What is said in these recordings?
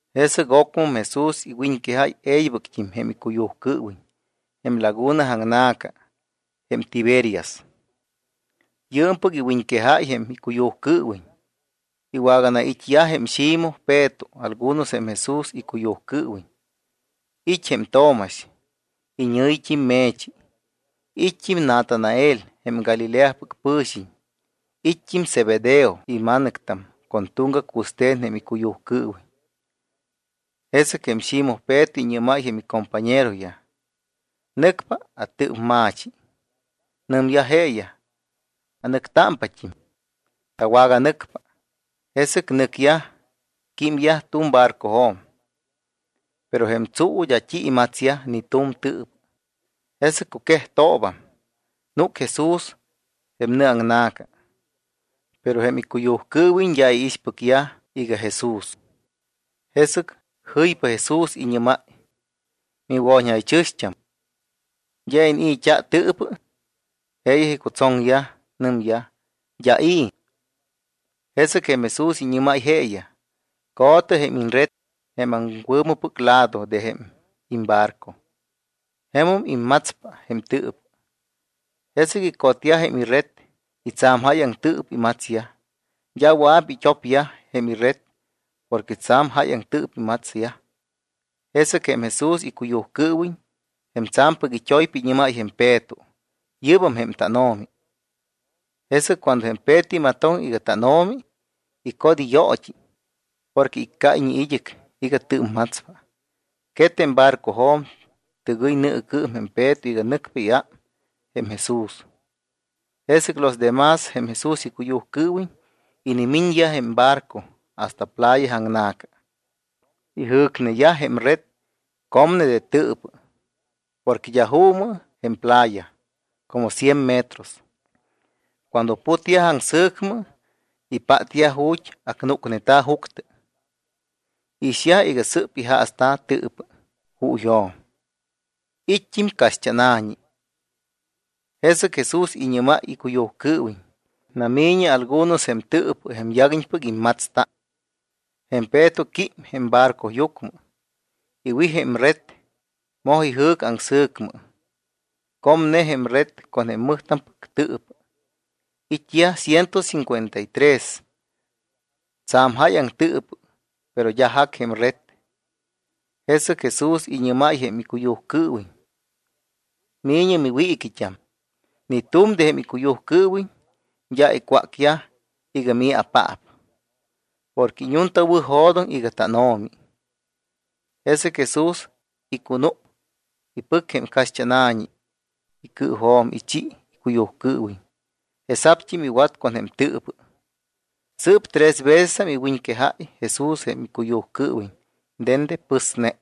Jesɨc ocmɨm Jesús iwiñquejáy e̱ybɨct́im jém icuyujcɨɨwiñ jém laguna aŋna̱ca jém Tiberias. Yɨɨmpɨc iwiñquejáy jém icuyujcɨɨwiñ. Iwaganait́yaj jém Ximoj Peto algunos jém Jesús icuyujcɨɨwiñ. It́ jém Tomax, iñɨ̱yit́im Me̱chi, it́t́im Natanael jém Galileapɨc pɨ̱xiñ, it́t́im Zebedeo ima̱nɨctam con tuŋgac wɨste̱n jém icuyujcɨɨwiñ. Jesɨc jém Ximoj Peto iñɨ́máy jém icompañeroyaj: —Nɨcpa atɨɨpma̱chi. Nɨmyaj jeeyaj: —Anɨctámpat́im. Tawaganɨcpa. Jesɨc nɨcyaj, químyaj tu̱m barcojo̱m. Pero jém tsuu d́a t́i imatsyaj ni tu̱m tɨɨpɨ. Jesɨc cuquejtoobam, núc Jesús jém nɨ aŋna̱ca. Pero jém icuyujcɨɨwiñ d́a iixpɨcyaj iga Jesús. Jesɨc jɨypa Jesús, iñɨ́máy: —¿Miwo̱ñjaychɨ̱xt́am, d́a iniit́t́a tɨɨpɨ? Jeeyaj icutsoŋyaj. Nɨmyaj: —D́a i̱. Jesɨc jém Jesús iñɨ́máy jeeyaj: —Co̱tɨ jém iñred jém aŋwɨ̱mɨpɨc lado de jém imbarco. Jemum immatspa jém tɨɨpɨ. Jesɨc icotyaj jém ired y tsa̱m jáyaŋ tɨɨpɨ imatsyaj. D́a wɨa̱p it́opyaj jém ired porque tsa̱m jáyaŋ tɨɨpɨ imatsyaj. Jesɨc jém Jesús icuyujcɨɨwiñ, jém tsa̱mpɨc it́oypa, iñɨ́máy jém Peto: —Yɨ́bam jém tánO̱mi. Jesɨc cuando jém Peto imatoŋ iga tánO̱mi, icot iyoot́i, porque iccáyñe id́ɨc iga tɨɨpmatspa. Quet jém barcojo̱m, tɨgɨy nɨɨcɨɨm jém Peto iga nɨcpa iám jém Jesús. Jesɨc los de más jém Jesús icuyujcɨɨwiñ inimiñyaj jém barco hasta playa aŋna̱ca. Ijɨ̱cneyaj jém red comne de tɨɨpɨ, porque d́a juumɨ jém playa como cien metros. Cuando putyaj aŋsɨ̱cmɨ, ipátyaj ju̱t́ acnúcneta̱ juctɨ. Iixyaj iga sɨ́p ijaasta̱ tɨɨpɨ juuyjo̱m, it́t́im caxt́ána̱ñi. Jesɨc Jesús iñɨ́máy icuyujcɨɨwiñ: —Nami̱ñɨ algunos jém tɨɨpɨ jém yaguiñpɨc immatsta. Jém Peto quím jém barcoyucmɨ, iwij jém ired, moj ijɨ̱c aŋsɨ̱cmɨ. Comne jém red con mɨjtampɨc tɨɨpɨ. It́yaj ciento cincuenta y tres. Tsa̱m jáyaŋ tɨɨpɨ, pero d́a jac jém red. Jesɨc Jesús iñɨ́máy jém icuyujcɨɨwiñ: —Mi̱ñɨ miwiiquit́am. Ni tu̱m de jém icuyujcɨɨwiñ d́a icwácyaj iga: “¿Mii̱apaap?” Porque iñuntawɨ̱jo̱doŋ iga tánO̱mi. Jesɨc Jesús icunúc, ipɨc jém caxt́ána̱ñi icɨɨjo̱m, ichi icuyujcɨɨwiñ, jesa̱pt́im iwat con jém tɨɨpɨ. Sɨɨp tres vecesam iwiñquejáy Jesús jém icuyujcɨɨwiñ dende pɨsne.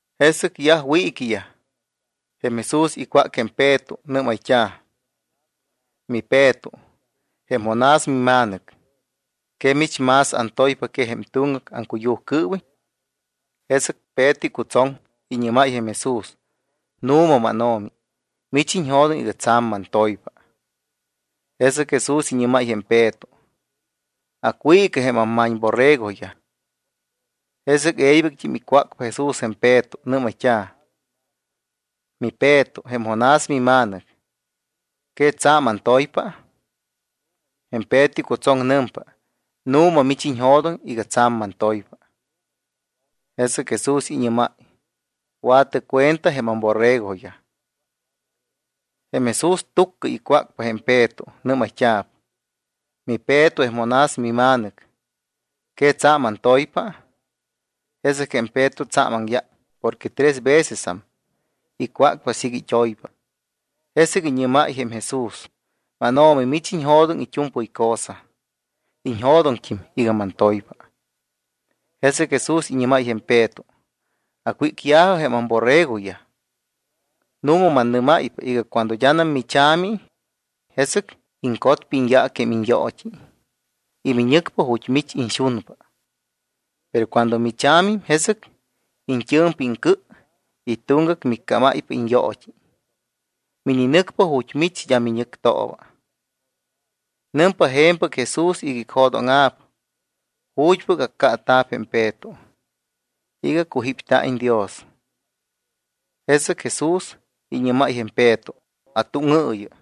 Jesɨc yaj wiiquiyaj, jém Jesús icwác jém Peto. Nɨ́mayt́a̱: —MiPeto, jém Jonás mima̱nɨc, ¿que mich más antoypa que jém tuŋgac aŋcuyujcɨɨwiñ? Jesɨc Peto icutsoŋ. Iñɨ́máy jém Jesús: —Nu̱ma, mánO̱mi, mich iñjo̱doŋ iga tsa̱m mantoypa. Jesɨc Jesús iñɨ́máy jém Peto: —Acwiicɨ jém amma̱ñborregoyaj. Jesɨc e̱ybɨct́im icwácpa Jesús jém Peto. Nɨ́mayt́a̱: —MiPeto, jém Jonás mima̱nɨc, ¿que tsa̱m antoypa? Jém Peto icutsoŋ. Nɨmpa: —Nu̱ma, mich iñjo̱doŋ iga tsa̱m mantoypa. Jesɨc Jesús iñɨ́máy: —Wa̱tɨ cuenta jém amborregoyaj. Jém Jesús túccɨyam icwácpa jém Peto. Nɨ́mayt́a̱p: —MiPeto, jém Jonás mima̱nɨc, ¿que tsa̱m antoypa? Jesɨc jém Peto tsa̱m aŋyác porque tres vecesam icwácpa siiga it́oypa, jesɨc iñɨ́máy jém Jesús: —MánO̱mi, mich iñjo̱doŋ it́u̱mpɨy cosa. Iñjo̱doŋt́im iga mantoypa. Jesɨc Jesús iñɨ́máy jém Peto: —Acwícya̱jɨ jém amborregoyaj. Nu̱ma mannɨ́máypa iga cuando d́anam micha̱mi, jesɨc iŋcotpa iñyaac jém iñyoot́i y miñɨcpa ju̱t́ mich iñxunpa. Pero cuando micha̱mim, jesɨc iñt́ɨ̱mpa iŋcɨ y tuŋgac miccámáypa iñyoot́i. Mininɨcpa ju̱t́ mich d́a miñɨctooba. Nɨmpa je̱mpɨc Jesús iga icjo̱dóŋa̱p ju̱t́pɨc accaata̱p jém Peto iga cujípta̱iñ Dios. Jesɨc Jesús iñɨ́máy jém Peto: —Atúŋɨɨyɨ.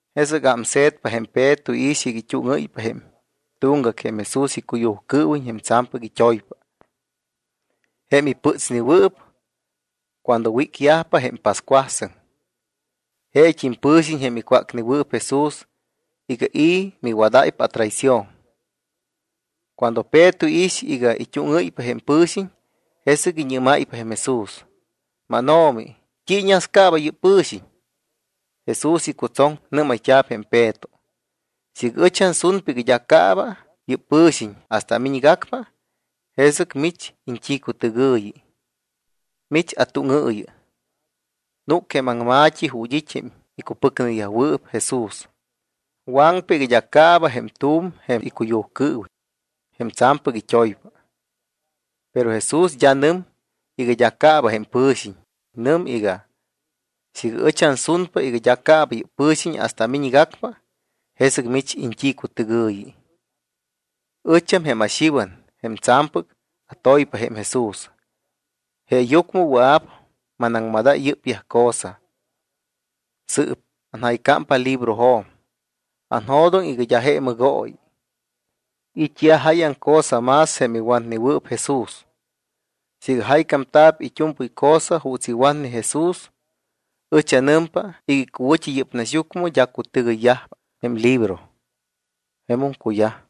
Jesɨc ámse̱tpa jém Peto, iix iga it́úŋɨ́ypa jém tuŋgac jém Jesús icuyujcɨɨwiñ jém tsa̱mpɨc it́oypa, jém ipɨtsnewɨɨp cuando wagawícyajpa jém pascuasɨŋ. Jeet́im pɨ̱xiñ jém icwácnewɨɨp Jesús iga: “¿I̱ miwadáypa atraición?” Cuando Peto iix iga it́úŋɨ́ypa jém pɨ̱xiñ, jesɨc iñɨ́máypa jém Jesús: —MánO̱mi, ¿t́i iñascaaba yɨ́p pɨ̱xiñ? Jesús icutsoŋ. Nɨ́mayt́a̱p jém Peto: —Siiga ɨch ansunpa iga d́a caaba yɨ́p pɨ̱xiñ hasta amiñgacpa, ¿jesɨc mich iñt́icutɨgɨ̱yɨ? Mich atúŋɨɨyɨ. Núc jém aŋma̱t́i ju̱t́ it́ jém icupɨcneyajwɨɨp Jesús, waŋpa iga d́a caaba jém tu̱m jém icuyujcɨɨwiñ, jém tsa̱mpɨc it́oypa. Pero Jesús d́a nɨm iga d́a caaba jém pɨ̱xiñ. Nɨm iga: “Siiga ɨch ansunpa iga d́a caaba yɨ́p pɨ̱xiñ hasta amiñgacpa, ¿jesɨc mich iñt́icutɨgɨ̱yɨ?” Ɨcham jém aXiwan jém tsa̱mpɨc atoypa jém Jesús, jeeyucmɨ wɨa̱p manaŋmadáy yɨ́pyaj cosa. Sɨɨp anjaycámpa librojo̱m. Anjo̱doŋ iga d́a je mɨgooyi. It́yaj jáyaŋ cosa más jém iwatnewɨɨp Jesús. Siiga jaycámta̱p it́u̱mpɨy cosa juuts iwatne Jesús, ɨch anɨmpa iga icuwɨ̱t́i yɨ́p naxyucmɨ d́a cutɨgɨyyajpa jém libro. Jemum cuyaj.